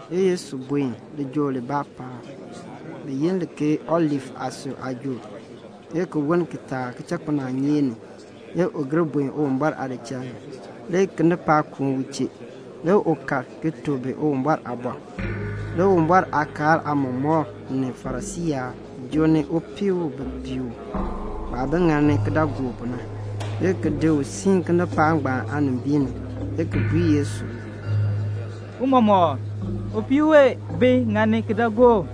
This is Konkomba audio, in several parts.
Le Yesu buen lijool libaa paab bi yi li ke Olif aasui aajool. Le ki woln kitaak kichakpinaanyeek ni le u gir buen Uwumbɔr aadichal ni. Le kinipaak kuun u chee. Le u kal ki tuk bi Uwumbɔr aaliin. Le Uwumbɔr aakaal aamɔmɔkb ni Farisii yaab joo ni upii u bi pii u, waah bi ŋani kidaagook pu na, le ki di u siin kinipaak ngbaan aanimbiin ni, le ki bui Yesu, "Tiicha, upii wee bi ŋani kidaagook,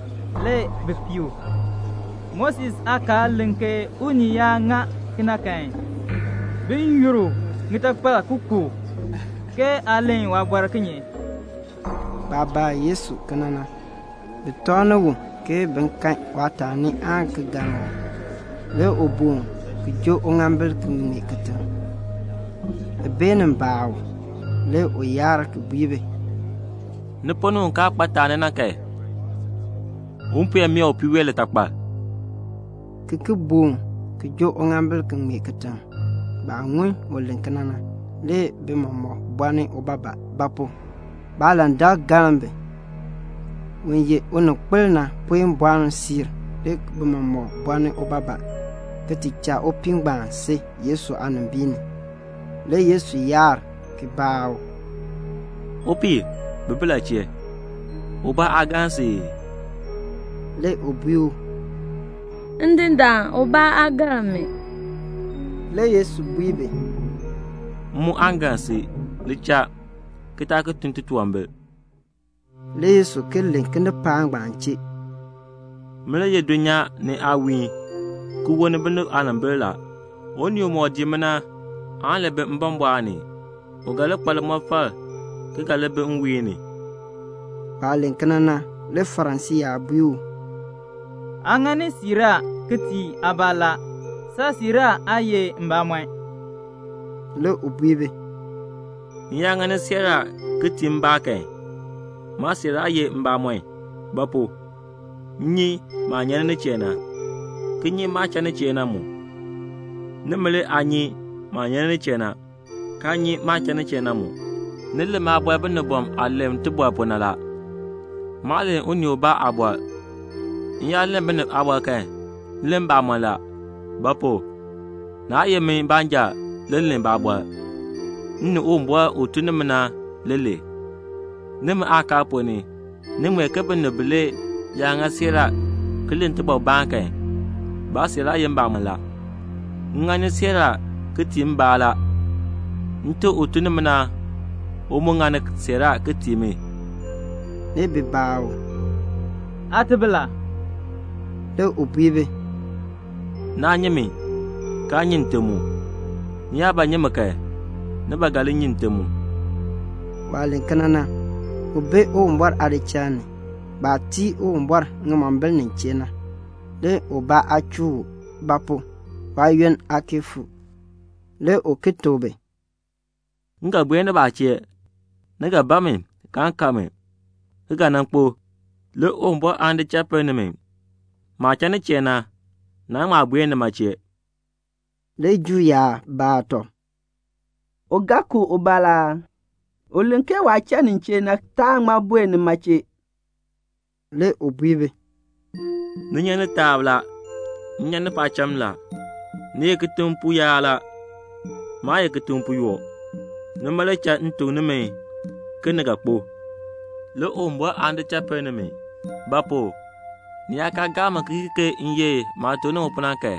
le bi pii u. Moses aakaal len ke unii yaa ŋa kena kan, bin yur u ŋitakpal ki ku u, ke aa len waabɔr kinye?" Baah baa Yesu kena na, bi tɔŋni u, ke bin kan waataani aan ki galn u. Le u boon ki joo uŋaambil ki ŋmee kitiŋ. Bi beenin baa u, le u yaar ki bui bi, "Ni ponn ni un kaa kpa taani na kan, un puen mee upii wee litakpal," ki ki boon ki joo uŋaambil ki ŋmee kitiŋ. Baah ŋun u len kena na, le bi mɔmɔk bolni ubaabaa; ba pu? baalandak galn bi. Un ye uninkpil na puen boln siir, le bi mɔmɔk bolni ubaabaa, ki ti cha upii ngbaan si Yesu aanimbiin ni. Le Yesu yaar ki baa u, "Upii, bi bi la chee? Ubaa aa galn si ii?" Le u bui u, "Ndindaan, ubaa aa galn mi." Le Yesu bui u, "M mu aan galn si. Li cha, ki taa ki tun titunwambir."] Le Yesu ki len kinipaak ngbaan chee, "Min le ye dulnyaa ni aawiihn ki wolni binib aanimbil la. Unii umɔk dii mi na kan aan li bi mbɔmbɔɔn ni. U ga li kpa limɔfal ki ga li bi nwiihn ni." Waah len kena na, le Farisii yaab bui u, "Aa ŋani siiraa ki tii aabaa la. Saasiiraa aa ye mbamɔn." Le u bui bi, "M yaa ŋani siiraa ki tii mbaa kan, maasiiraa ye mbamɔn; ba pu? m nyi maah nyan nin chee na, ki nyi maah cha nin chee na mu. Nimi le aa nyi maah nyan nin chee na, kaa nyi maah cha nin chee na mu. Ni len maabɔr binibɔm aah len tibɔr pu na la. Maa len unii ubaa aabɔr. M yaa len binib aabɔr kan, m len mbamɔn la; ba pu? naa ye min baanja le len baabɔr, m ni Uwumbɔr u tun ni mi na le len. Nimi aakaal ponn ni, ni ŋmee ke binib bilee yaa ŋa siiraa ki len tibɔrbaan kan, baasiiraa ye mbamɔn la. M ŋani siiraa ki tii mbaa la. Nte u tun ni mi na, u mu ŋani siiraa ki tii mi." Le bi baa u, "Aate bi la?" Le u bui bi, "Naa nyi mi, kaa nyi Nte mu. Ni yaa ba nyi mi kan, ni ba ga li nyi Nte mu." Waah len kena na, u bi Uwumbɔr aadichal ni, baah tii Uwumbɔr ŋimombil nin chee na. Le ubaa aa chuu u; ba pu? waayoonn aa kee fuu. Le u ki tuk bi, "M ga buen nibaa chee. Ni ga ban mi, kaan kan mi, ki ga nan kpo; le Uwumbɔr aan di cha pinn nimi. Maah cha nin chee na, naan ŋma buen nima chee." Le Juu yaab baa tɔb, "U ga ku ubaa la aa? U len ke waah cha nin chee na, taan ŋma buen nima chee." Le u bui bi, "Ni nyan ni taab la. M nyan ni paacham la. Ni ye kitiŋ pu yaab la. Maa ye kitiŋ pu yoo. Nima le cha m tuk nimi ke ni ga kpo; le Uwumbɔr aan di cha pinn nimi; ba pu? ni yaa kaa gaa mi ki kii ke m ye maah tuk nimi pu na kan,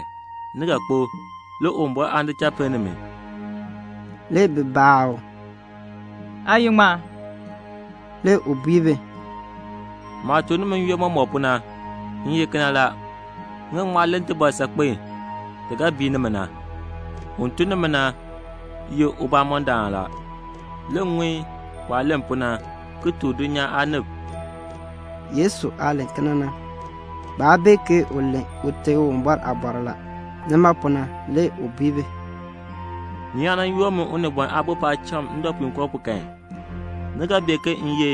ni ga kpo, le Uwumbɔr aan di cha pinn nimi." Le bi baa u, "Aa ye ŋmaa?" Le u bui bi, "Maah tuk nimi n-yoonn mɔmɔk pu na, m ye kena la. M ga ŋma len tibɔr saakpen ti ga bii nimi na. Un tun ni mi na ye mbamɔndaan la. Le m ŋun waah len pu na, ki tuk dulnyaa aanib." Yesu aah len kena na, baa bee ke u len Ute Uwumbɔr aabɔr la. Nima pu na le u bui bi, "Ni yaa nan yoor min Unibɔn Aabo paacham ndɔpuinkoo pu kan, ni ga bee ke m ye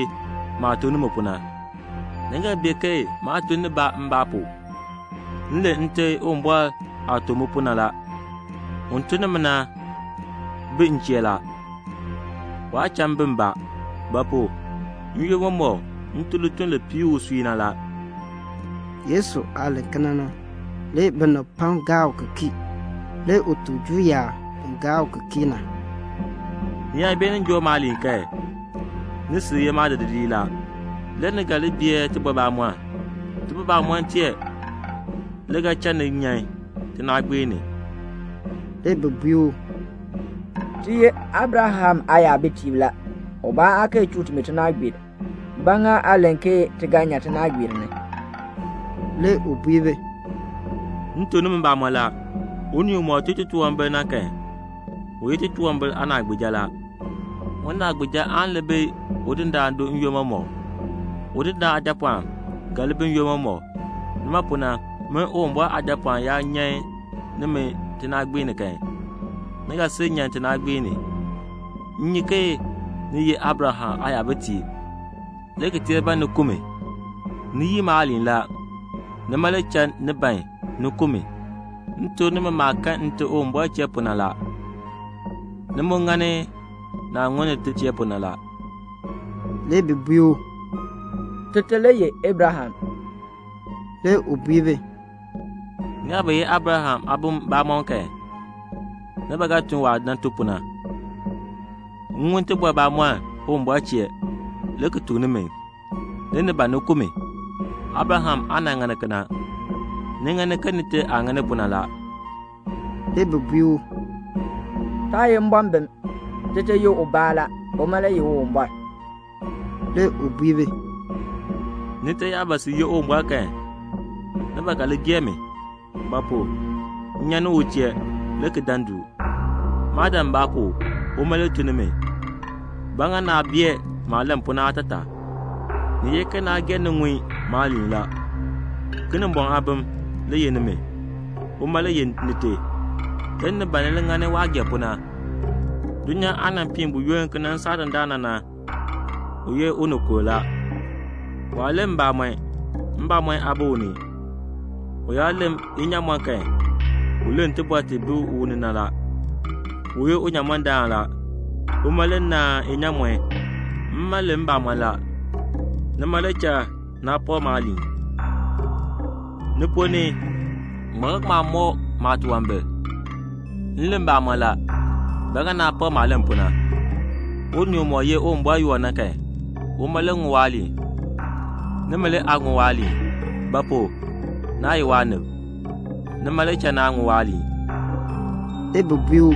maah tuk nimi pu na. Ni ga bee ke maa tun nibaa mbaa pu. M len Nte Uwumbɔr aah tuk mi pu na la. Un tun ni mi na bi m chee la. Waa cha m bi mbaa; ba pu? n-yoonn mɔmɔk m tun lituln li piir usui na la." Yesu aah len kena na, le binib pam gaa u ki kii. Le u tuk Juu yaab bi gaa u ki kii na, "Ni yaa beenin joo maaliin kan, ni sil ye maadidiliib la. Le ni ga li bee tibɔr bamɔnn. Tibɔr bamɔnn tee le ga cha ni nyan tinaagbiir ni." Le bi bui u, "Ti ye Abraham aayabitiib la. Ubaa aa kee chuu timi tinaagbiir. Ba ŋa aa len ke ti ga nyan tinaagbiir ni?" Le u bui bi, "M tuk nimi mbamɔn la, unii umɔk tun titunwambir na kan, u ye titunwambir aanaagbiija la. Unaagbiija aan li bi udindaan do n-yoonn mɔmɔk. Udindaan aajapɔɔn ga li bi n-yoonn mɔmɔk. Nima pu na, min Uwumbɔr Aajapɔɔn yaa nyan nimi tinaagbiir ni kan, ni ga sil nyan tinaagbiir ni. M nyi ke ni ye Abraham aayabitiib, le ki tee ban ni ku mi. Ni yii maaliin la. Nima le cha ni ban ni ku mi. M tuk nimi maah kan Nte Uwumbɔr chee pu na la. Ni mu ŋani naah ŋun nite chee pu na la." Le bi bui u, "Tite le ye Abraham." Le u bui bi, "Ni yaa ba ye Abraham aabilb bamɔnn kan, ni ba ga tun waah nan tun pu na. M ŋun tibɔr bamɔnn Uwumbɔr chee, le ki tuk nimi. Le ni ban ni ku mi. Abraham aa nan ŋani kena. Ni ŋani ke nite aah ŋani pu na la." Le bi bui u, "Taa ye mbɔmbim. Tite ye ubaa la. Uma le ye Uwumbɔr." Le u bui bi, "Nite yaa ba sil ye Uwumbɔr kan, ni ba ga li gee mi; ba pu? m nyan ni u chee le ki dan du. Maa dan mbaa pu. Uma le tun ni mi. Ba ŋa naa bee maah len pu na aatataa? Ni ye ke naa gee ni ŋun maaliin la. Kinimbɔŋ aabim le ye nimi, uma le ye nite. Le ni ban ni li ŋani waah gee pu na. Dulnyaa aah nan piin buyoonn ki nan saa dandana na, u ye unikur la. Waa len mbamɔn. Mbamɔn aa bi u ni. U yaa len inyaamɔn kan, u len tibɔr ti bi u ni na la. U ye unyamɔndaan la. Uma le naan inyaamɔn. Mma len mbamɔn la. Nima le cha naa pak maaliin. Ni ponn ni, ŋmaa ga ŋma mɔk maatunwambir? M len mbamɔn la. Ba ŋa naa pak maah len pu na? Unii umɔk ye Uwumbɔr yoo na kan, uma le ŋun waaliin. Nimi le aa ŋun waaliin. Ba pu? Naa ye waanib. Nima le cha naa ŋun waaliin." Le bi bui u,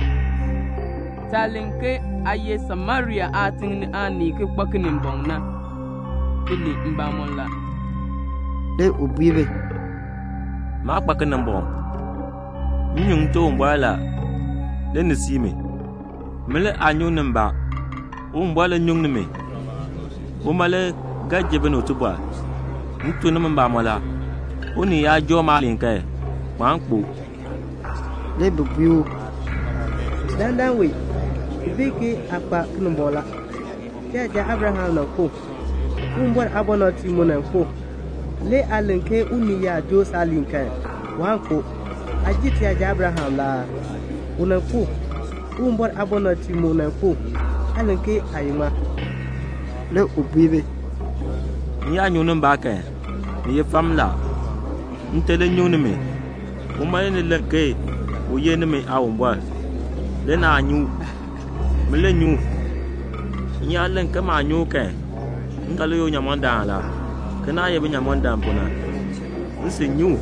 "Taah len ke aa ye Samaria aatiŋ aanii ki kpa Kinimbɔŋ na, ti len mbamɔn la." Le u bui bi, "Maa kpa Kinimbɔŋ. M nyuŋ Nte Uwumbɔr la. Le ni sii mi. Min le aa nyuŋni mbaa; Uwumbɔr le nyuŋni mi. Uma le ga ji binib tibɔr. M tuk nimi mbamɔn la, unii yaa joo maaliin kan, waan kpo." Le bi bui u, "Dandana wee ti bee ke aa kpa Kinimbɔŋ la. Tiyaja Abraham nan kpo. Uwumbɔr aabɔnabtiib mu nan kpo, le aa len ke unii yaa joo saaliin kan, waan kpo. Aa jer tiyaja Abraham la aa? U nan kpo. Uwumbɔr aabɔnabtiib mu nan kpo. Aa len ke aa ye ŋmaa?" Le u bui bi, "M yaa nyuŋni mbaa kan, ni ye fam la; Nte le nyuŋni mi. Uma le ni len ke u ye nimi Aawumbɔr. Le naa nyi u. Min le nyi u. M yaa len ke maa nyi u kan, m ga li ye unyamɔndaan la, ke naah ye binyamɔndam pu na. M sil nyi u,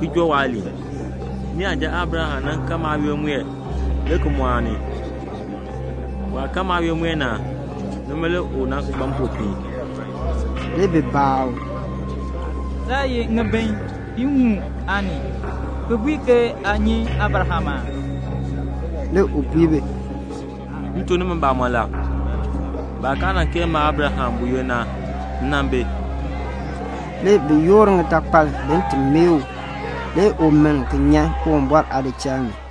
ki joo waaliin. Niyaja Abraham nan kan maayoonn mue le ki mɔɔni. Waah kan maayoonn mue na, nima le u nan kpa mpopiin." Le bi baa u, "Saa ye ŋibin piiŋmu aanii, ki bui ke aa nyi Abraham aa?" Le u bui bi, "M tuk nimi mbamɔn la, baah kaa nan kee ma Abraham buyoonn na, m nan bi." Le bi yoor ŋitakpal bin ti mae u. Le u miln ki nyan Uwumbɔr aadichal ni.